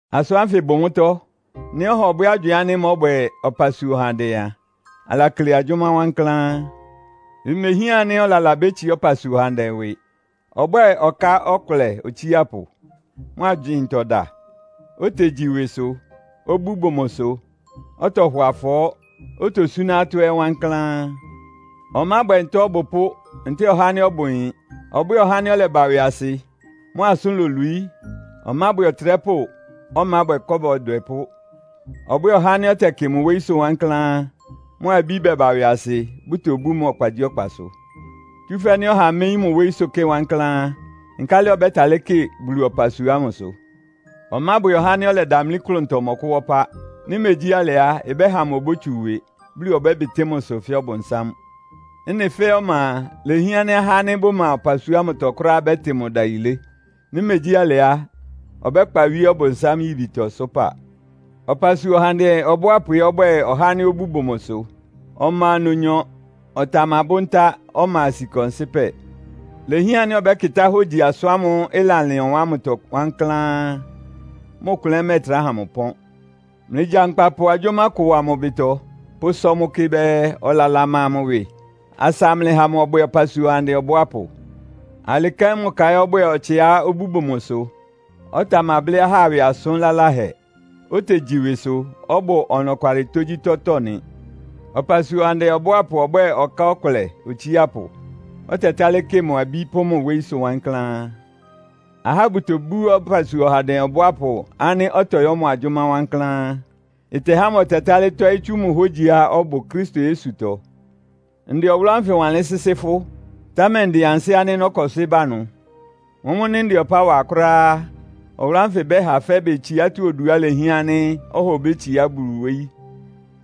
Asʋ́n ánfɩ bʋ mʋ́tɔ́. Nɩ́ ɔha ɔbwɛ́ agywɩɩn ánɩ́ mɔ́bwɛ ɔpasua ɔhandɛ a, alakle agyʋ́má wankláán. Imehián ánɩ́ ɔlala bétsiá ɔpasua ɔhandɛ ɩwɩ. Ɔbwɛ́ɛ ɔka ɔkʋlɛ otsiápʋ, mʋ agywɩɩntɔ da, otegyi ɩwɩsʋ, obú bʋ mʋsʋ, ɔtɔhɔ afɔɔ́, otosúná atɔ́ ɛ́ wankláán. Ɔmábwɛ nta ɔbʋpʋ́ ntɛ́ɛ ɔhá ánɩ́ ɔbʋ ɩyɩn. Ɔbwɛ́ɛ ɔhá ánɩ́ ɔlɛba ɩwɩasɩ, mʋ asʋ́n lolwií. Ɔmábwɛ ɔtrɛ́pʋ́, ɔmábwɛ kɔ́ba ɔdwɛpʋ́. Ɔbwɛ́ɛ ɔhá ánɩ́ ɔtɛkɩ mʋ wóyísʋ́ wankláán, mʋ abí bɛba ɩwɩasɩ, bʋtobú mʋ ɔkpagyíɔkpasʋ. Tsúfɛ́ nɩ́ ɔha méyín mʋ wóyísʋ́ kɩ wankláán á, nkálɩ ɔbɛ́talɩ́ kɩ Bulu ɔpasua ámʋsʋ? Ɔmábwɛ ɔhá ánɩ́ ɔlɛdamlí klʋntɔ mɔkʋ́wá ɔpá. Nɩ́ megyí alɩ á, ɩbɛ́ha mʋ obótsu ɩwɩ, Bulu ɔbɛ́bɩtɩ́ mʋ ɩsʋ fɛ́ Ɔbʋnsám. Ɩ́nɩ fɛ́ɛ́ ɔma a, ilehián ánɩ́ ahá ánɩ́ bʋma ɔpasua ámʋtɔ kʋ́ráá bɛ́tɩ mʋ ɩdayilé. Nɩ́ megyí alɩ á, ɔbɛ́kpa wíé Ɔbʋnsám yibitɔ sʋ́pa. Ɔpasua ɔhandɛ ɔbʋápʋ ɛ́ ɔbwɛ́ɛ ɔhá ánɩ́ obú bʋ mʋsʋ, ɔma nnonyɔ, ɔtamabʋ́ ntá, ɔma sika ɔnsɩ́pɛ. Ilehián ánɩ́ ɔbɛ́kɩtá hógyi asʋ́n ámʋ́ʋ́ ɩlalɩn ɔwan ámʋtɔ wankláán, mʋ klʋn ɛ́ mɛ́ɛtrá ha mʋ ɩpɔ́n. Mlɩgyankpa pʋ agyʋ́má ɩkʋ wa mʋ ɩbɩtɔ, pʋsɔ mʋ kɩ bɛɛ ɔlala ma mʋ ɩwɩ, asa amlɩha mʋ ɔbwɛ ɔpasua ɔhandɛ ɔbʋápʋ. Alɩ kɛ́n mʋ ka ɛ́ ɔbwɛ́ɛ ɔtsɩá obú bʋ mʋsʋ, ɔtamablɩ́ ahá ɩwɩ asʋn laláhɛ, otegyi ɩwɩsʋ, ɔbʋ ɔnɔkwalɩ tógyítɔ́tɔ́ nɩ. Ɔpasua ɔhandɛ ɔbʋápʋ ɔbwɛ́ɛ ɔka ɔkʋlɛ otsiápʋ, ɔtɛtálɩ́ kɩ mʋ abí pʋ́ mʋ wóyísʋ́ wankláán. Ahá bʋtobú ɔpasua ɔhandɛ ɔbʋápʋ ánɩ́ ɔtɔyɔ́ mʋ agyʋ́má wankláán. Ɩtɛhá mʋ ɔtɛtálɩ́ tɔ́ɩ́ tsú mʋ hógyiá ɔbʋ Kristo Yesutɔ. Ndɛ ɔwʋlʋ́ ánfɩ wanlɩ́n sɩ́sɩ́ fʋ́, támɛ ndɩn ansɩ́ ánɩ́ nɔ́kɔsɩ́ ba ɩnʋ. Mʋ́mʋ́ nɩ́ ndɛ ɔpá wa kʋ́ráá á, ɔwʋlʋ́ ánfɩ ɩbɛ́ha fɛ́bɩ tsiátɔ́ oduá ilehián ánɩ́ ɔha obétsiá Bulu wóyí,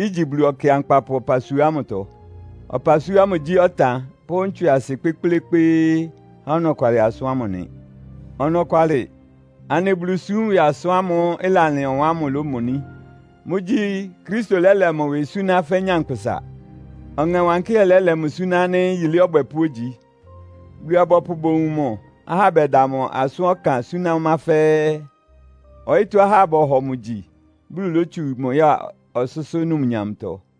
igyi Bulu Ɔkɩankpapʋ ɔpasua ámʋtɔ. Ɔpasua ámʋ gyí ɔtan pʋ́ ntswɩasɩ kpékplékpéé há ɔnɔkwalɩ asʋ́n ámʋ nɩ. Ɔnɔkwalɩ, anɩ Bulusúm ɩwɩ asʋ́n ámʋ́ʋ́ ɩlalɩn ɔwan ámʋ lómoní. Mʋ́gyí, Kristo lɛ́lɛ mʋ ɩwɩ súná fɛ́ nyankpʋsa. Ɔŋɛ Wankɩ́hɛ́ lɛ́lɛ mʋ suná ánɩ́ yilé ɔbwɛpʋ́ ogyi. Bulu-abɔpʋ bowun mʋ, ahá bɛda mʋ asʋ́n ɔkan súná ɔmá fɛ́ɛ́. Ɔyɩ́tɔ́ ahá bɔhɔ mʋ gyi, Bulu lótsu mʋ ya ɔsʋ́sʋ́ numnyamtɔ.